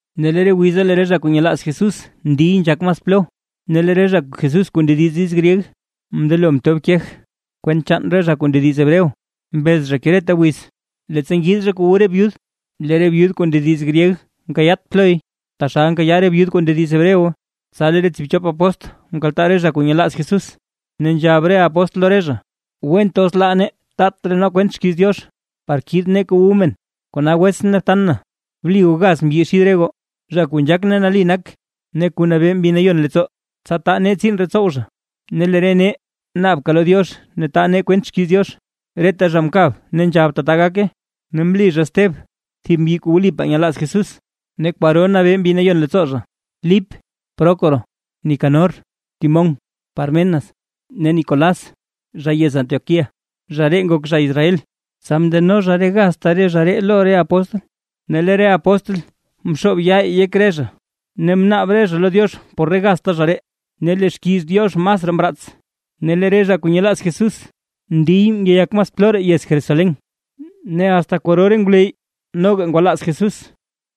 Ne re wiza lee re zha kuu nyelaaz Jesús ndiy nzhak mas plo, ne lee re zha Jesús kuu ndediz diiz gryeg, mndelo mtob kej kwent chaan re zha kuu ndediz Hebreo. Mbez zha ke reta wiz, leettsa ngiid zha kuu wu re byud, lee re byud kuu ndediz gryeg nkayaat ploy, taxal nkayaa re byud kuu ndediz Hebreo. Tsa lee re tsiibchop apóstl mkaltaa re zha kuu nyelaaz Jesús, ne nzhab re apóstl lo re zha: ―Went os laa nee taat raa nee kwent xkiiz Diox, par kiid nee kuu wu re men. Kona wets ne btan, bli goo gaz mbyi xid re goo, zha kuu nzhak ne nali nak ne kuu nabee Mbi Nayon leettsoo, tsa taa nee tsiin ree tsow zha. Ne lee re nee naabka lo Diox ne taa nee kwent xkiiz Diox. Reta zha mkab nzhab tata gake, ne mli zha Steb, thib mbyi kuu wlipaa nyelaaz Jesús ne kwaro nabee Mbi Nayon leettsoo zha, Lip, Prócoro, Nicanor, Timón, Pármenas ne Nicolás zha yez Antioquía (zha ree ngok zha Israel). Tsa mndeno zha re gazta re zha ree lo re apóstl, ne lee re apóstl mxoob yaa yek re zha, ne mnaab re zha lo Diox por re gazta zha ree. Ne lee xkiiz Diox masraa mraats, ne lee re zha kuu nyelaaz Jesús ndiy ngeyak mas plo raa yez Jerusalén. Ne asta kwaro re ngwleyy noga ngwalaaz Jesús.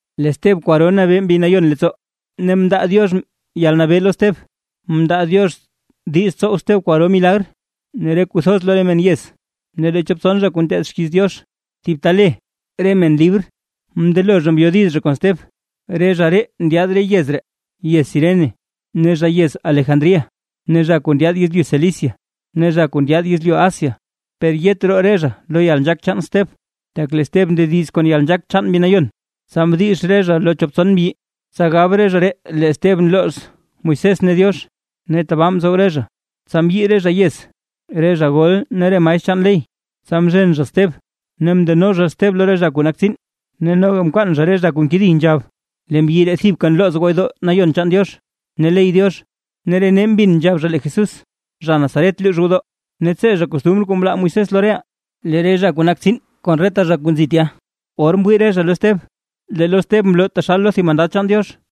Lee Steb kwaro nabee Mbi Nayon leettsoo ne mndaa Diox yalnabee lo Steb, mndaa Diox diiz tsow Steb kwaro milagr ne re kuu thoz lo re men yez. Ne lee chop tson zha kuu nteed xkiiz Diox thib ta le: “Re men Libr” mndelo zha mbyodiz kon Steb, re zha ree ndyaad re yez ree, yez Cirene ne zha yez Alejandría, ne zha kuu ndyaad yezlyu Cilicia, ne re zha kuu ndyaad yezlyu Asia. Per yet roo re zha lo yalnzhaak chaan Steb, tak lee Steb ndediz kon yalnzhaak chaan Mbi Nayon. Tsa mdix re zha lo chop tson mbyi, tsa gab re zha ree lee Steb nlooz Moisés ne Diox. Ne tabaa mtsow re zha, tsa mbyii re zha yez, re zha gol ne re maestr chaan ley. Tsa mzhen zha Steb ne mndeno zha Steb lo re zha kuu nak tsiin. Ne noga mkwaan re zha re zha kuu nkedi nzhab: ―Lee mbyi ree thibka nlooz gwodoo Nayon chaan Diox ne ley Diox. Ne re nee mbin nzhab zha lee Jesús, zha Nazaret luux gwodoo, ne tsee zha costumr kuu mlaa Moisés lo reʼaa. Lee re zha kuu nak tsiin kon reta zha kuu nzi tya, or mwii re zha lo Steb, lee lo Steb mloo taxal lo thib mandad chaan Diox.